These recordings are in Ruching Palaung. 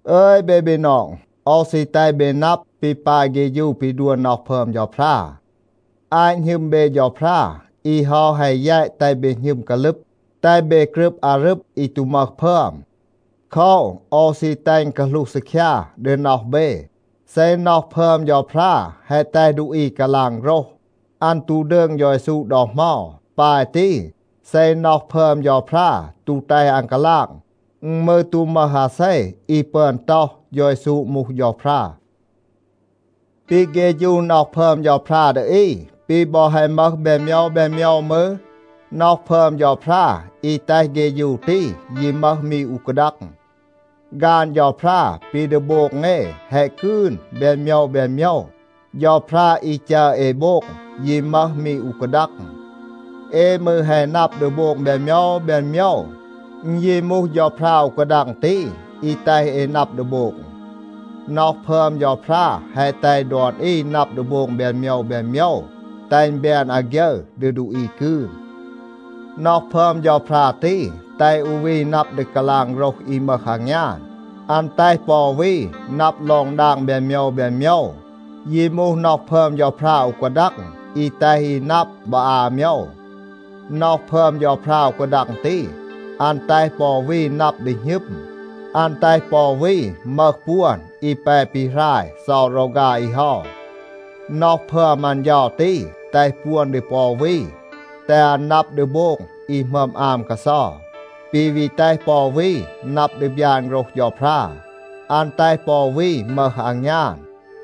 อึย เบ บีนอง, โอว ซี แตห เบ นับ ปี ปาย เฆฌู ปี ดัว น็อห พึอม เฌาพรา. อาต หณึม เบ เฌาพรา, อี เฮา แฮะ แยต แตห เบ หณึม กาลึบ, แตห เบ กรึบ อารึบ อี ตู มึห พึอม. โคว, โอว ซี แตห อึณ กาหลูห ซีคยา ดี น็อห เบ. เซ น็อห พึอม เฌาพรา แฮะ แตห ดูอี กาลาง โฆรห, อัน ตู ดืง เฌา เยซู ดอ เหมา. ปาย ตี, เซ น็อห พึอม เฌาพรา ตู แตห อัน กาลาง, อึณ มืร ตู มึห อาเซ อี ปึอน ต็อห, “เฌา เยซู มูห เฌาพรา.” ปี เฆฌู น็อห พึอม เฌาพรา ดี อี ปี บอ แฮะ มึห แบน โมยว แบน โมยว มืร, น็อห พึอม เฌาพรา อี แตห เฆฌู ตี ยี มึห มี อู กาดัง. ฆาน เฌาพรา ปี ดี โบง เอ แฮะ กืน แบน โมยว แบน โมยว. เฌาพรา อี จัร เอ โบง ยี มึห มี อู กาดัง. เอ มืร แฮะ นับ ดี โบง แบน โมยว แบน โมยว. อึณ ยี มูห เฌาพรา อู กาดัง ตี อี แตห เอ นับ ดี โบง. น็อห พึอม เฌาพรา แฮะ แตห ดอน อี นับ ดี โบง แบน โมยว แบน โมยว, แตห อึณ แบน อาฆยึร ดี ดูอี กืน. น็อห พึอม เฌาพรา ตี แตห อู วี นับ ดี กาลาง โฆรห อี มึห อางยาน. อัน แตห ปอ อู วี นับ ลอง ดาง แบน โมยว แบน โมยว. ยี มูห น็อห พึอม เฌาพรา อู กาดัง อี แตห อี นับ บอ อา โมยว. น็อห พึอม เฌาพรา อู กาดัง ตี, อัน แตห ปอ อู วี นับ ดี หณึม. อัน แตห ปอ อู วี มึห ปวน อี แป ปีหราย เซา รอฆา อี เฮา. น็อห พึอม อัน เฌา ตี แตห ปวน ดี ปอ อู วี, แตห อัน นับ ดี โบง อี หมึอม อาม กาเซา. ปี วี แตห ปอ อู วี นับ ดี บยาน โฆรห เฌาพรา. อัน แตห ปอ อู วี มึห อางยาน,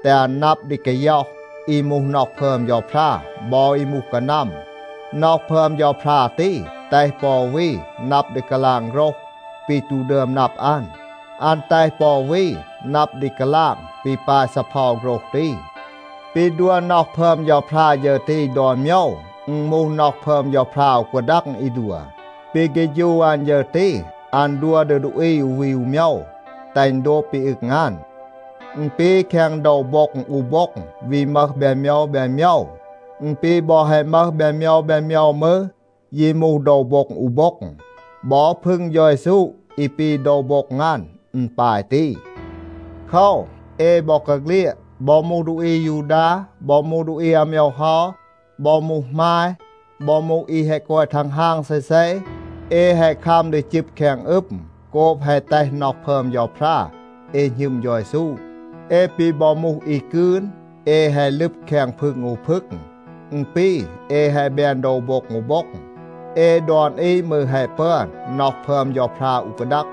แตห อัน นับ ดี กาย็อห อี มูห น็อห พึอม เฌาพรา บอ อี มูห กานัม. น็อห พึอม เฌาพรา ตี แตห ปอ อู วี นับ ดี กาลาง โฆรห ปี ตู ดึอม นับ อัน. อัน แตห ปอ อู วี นับ ดี กาลาง ปี ปาย ซีเพา โฆรห ตี. ปี ดัว น็อห พึอม เฌาพรา ฌึร ตี ดอน โมยว, อึณ มูห น็อห พึอม เฌาพรา อู กาดัง อี ดัว. ปี เฆฌู อัน ฌึร ตี อัน ดัว ดี ดูอี อู วี อู โมยว, แตห อึณ โดบ ปี อึง อัน. อึณ ปี แคง โดว โบ็ง อู โบ็ง วี มึห แบน โมยว แบน โมยว. อึณ ปี บอ แฮะ มึห แบน โมยว แบน โมยว มืร, ยี มูห โดว โบ็ง อู โบ็ง. บอ พึง เฌา เยซู อี ปี โดว โบ็ง อัน, อึณ ปาย ตี. โคว, เอ บอกาเฆลียด, บอ มูห ดูอี อายูดา, บอ มูห ดูอี อาโมยว เฮา, บอ มูห หมาย, บอ มูห อี แฮะ กอย ทังฮาง เซเซ, เอ แฮะ คัม ดี จึบ แคง อึม โกบ แฮะ แตห น็อห พึอม เฌาพรา เอ หณึม เฌา เยซู. เอ ปี บอ มูห อี กืน, เอ แฮะ ลึบ แคง พึง อู พึง. อึณ ปี เอ แฮะ แบน โดว โบ็ง อู โบ็ง. เอ ดอน อี มืร แฮะ ปึอน น็อห พึอม เฌาพรา อู กาดัง,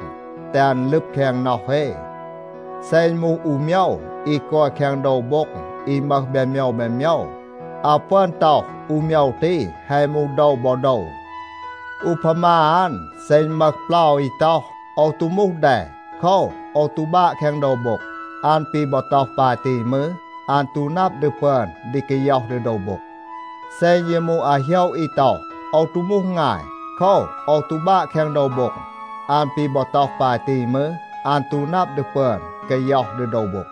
แตห อัน ลึบ แคง น็อห เอ. เซ อึณ มูห อู โมยว อี กอย แคง โดว โบ็ง อี มึห แบน โมยว แบน โมยว, อาว ปึอน ต็อห อู โมยว ตี แฮะ มูห โดว บอ โดว. อูพามา อัน, เซ อึณ มึห เปลา อี ต็อห, “โอว ตู มูห แด. โคว, โอว ตู บาะ แคง โดว โบ็ง,” อัน ปี บอ ต็อห ปาย ตี มืร, อัน ตู นับ ดี ปึอน ดี กาย็อห ดี โดว โบ็ง. เซ อึณ ยี มูห อาโหยะ อี ต็อห, “โอว ตู มูห งาย. โคว, โอว ตู บาะ แคง โดว โบ็ง,” อัน ปี บอ ต็อห ปาย ตี มืร, อัน ตู นับ ดี ปึอน กาย็อห ดี โดว โบ็ง.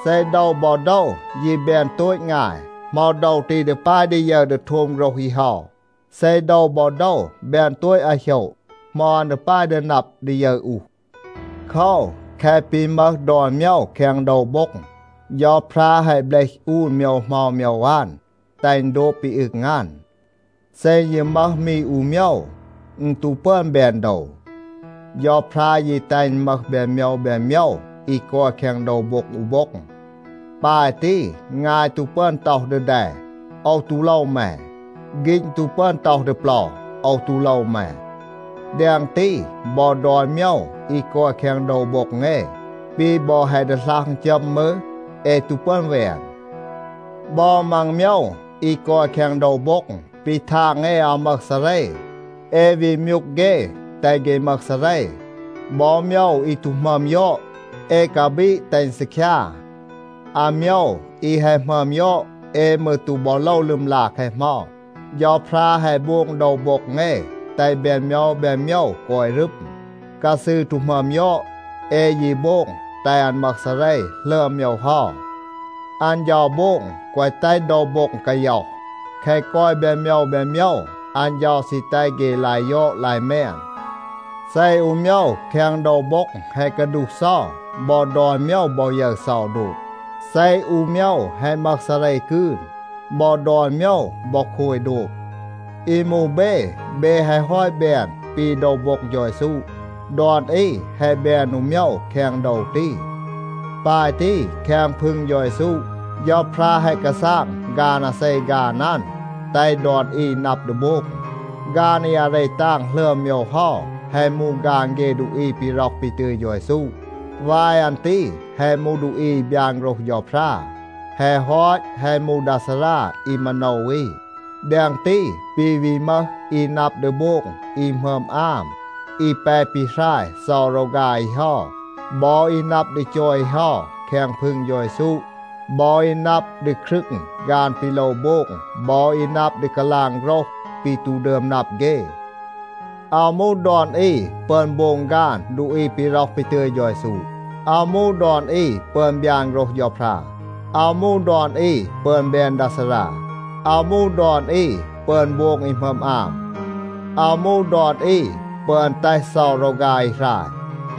เซ โดว บอ โดว ยี แบน โตต งาย, เหมา โดว ตี ดี ปาย ดี ยึร ดี โทม โฆรห อี เฮา? เซ โดว บอ โดว แบน โตต อาโหยะ, เหมา อัน ดี ปาย ดี นับ ดี ยึร อูห? โคว, แคะ ปี มึห ดอน โมยว แคง โดว โบ็ง, เฌาพรา แฮะ เบลห อูน โมยว เหมา โมยว อัน, แตห อึณ โดบ ปี อึง อัน. เซ อึณ ยี มึห มี อู โมยว, อึณ ตู ปึอน แบน โดว. เฌาพรา ยี แตห อึณ มึห แบน โมยว แบน โมยว อี กอย แคง โดว โบ็ง อู โบ็ง. ปาย ตี, งาย ตู ปึอน ต็อห ดี แด, “โอว ตู โลว แม.” ฆีณ ตู ปึอน ต็อห ดี เปลา, “โอว ตู โลว แม.” แดง ตี, บอ ดอน โมยว อี กอย แคง โดว โบ็ง เอ, ปี บอ แฮะ ดีหลัห อึณจัม มืร, เอ ตู ปึอน แวน. บอ มัง โมยว อี กอย แคง โดว โบ็ง, ปี ทาง เอ อาว มึห ซาเร, เอ วี มยูก เฆ, แตห เฆ มึห ซาเร. บอ โมยว อี ตู หมึอม ยอด, เอ กาบีด แตห อึณ ซีคยา. อาโมยว อี แฮะ หมึอม ยอด, เอ มืร ตู บอ โลว ลึมลา แคะ เหมา. เฌาพรา แฮะ โบง โดว โบ็ง เอ แตห แบน โมยว แบน โมยว กอย รึม. กาซืร ตู หมึอม ยอด, เอ ยี โบง แตห อัน มึห ซาเร หลึอม โมยว เฮา. อัน เฌา โบง แกวะ แตห โดว โบ็ง กาย็อห. แคะ กอย แบน โมยว แบน โมยว, อัน เฌา ซี แตห เฆ ลาย ยอด ลาย แมน. เซ อู โมยว แคง โดว โบ็ง แฮะ กาดูห เซา, บอ ดอน โมยว บอ ยึร เซา โดบ. เซ อู โมยว แฮะ มึห ซาเร กืน, บอ ดอน โมยว บอ โคย โดบ. อี มูห เบ, เบ แฮะ ฮอต แบน ปี โดว โบ็ง เฌา เยซู. ดอน อี แฮะ แบน อู โมยว แคง โดว ตี. ปาย ตี, แคง พึง เฌา เยซู, เฌาพรา แฮะ กาซาง ฆาน อาเซ ฆาน อัน, แตห ดอน อี นับ ดี โบง. ฆาน อี อาเร ตาง หลึอม โมยว เฮา แฮะ มูห ฆาน เฆ ดูอี ปี ร็อห ปี ตึย เฌา เยซู. วาย อัน ตี แฮะ มูห ดูอี อี บยาน โฆรห เฌาพรา. แฮะ ฮอต, แฮะ มูห ดา ซารา อี มาโนว อี. แดง ตี, ปี วี มึห อี นับ ดี โบง อี หมึอม อาม, อี แป ปีหราย เซา รอฆา อี เฮา บอ อี นับ ดี จอย อี เฮา แคง พึง เฌา เยซู บอ อี นับ ดี ครึง ฆาน ปี โลว โบง บอ อี นับ ดี กาลาง โฆรห ปี ตู ดึอม นับ เฆ. อาว มูห ดอน อี ปึอน โบง ฆาน ดูอี ปี ร็อห ปี ตึย เฌา เยซู. อาว มูห ดอน อี ปึอน บยาน โฆรห เฌาพรา. อาว มูห ดอน อี ปึอน แบน ดา ซารา. อาว มูห ดอน อี ปึอน โบง อี หมึอม อาม. อาว มูห ดอน อี ปึอน แตห เซา รอฆา อี หราย.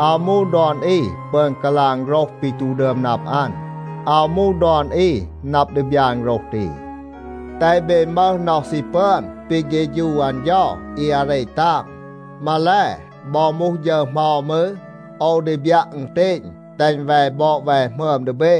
อาว มูห ดอน อี ปึอน กาลาง โฆรห ปี ตู ดึอม นับ อัน. อาว มูห ดอน อี นับ ดี บยาน โฆรห ตี. แตห เบ มึห น็อห ซี ปึอน ปี เฆฌู อัน เฌา อี อาเร ตาง. มาแล, บอ มูห ฌึร เหมา มืร, โอว ดี บยัะ อึณเตณ แตห อึณ แว บอด แว หมึอม ดี เบ.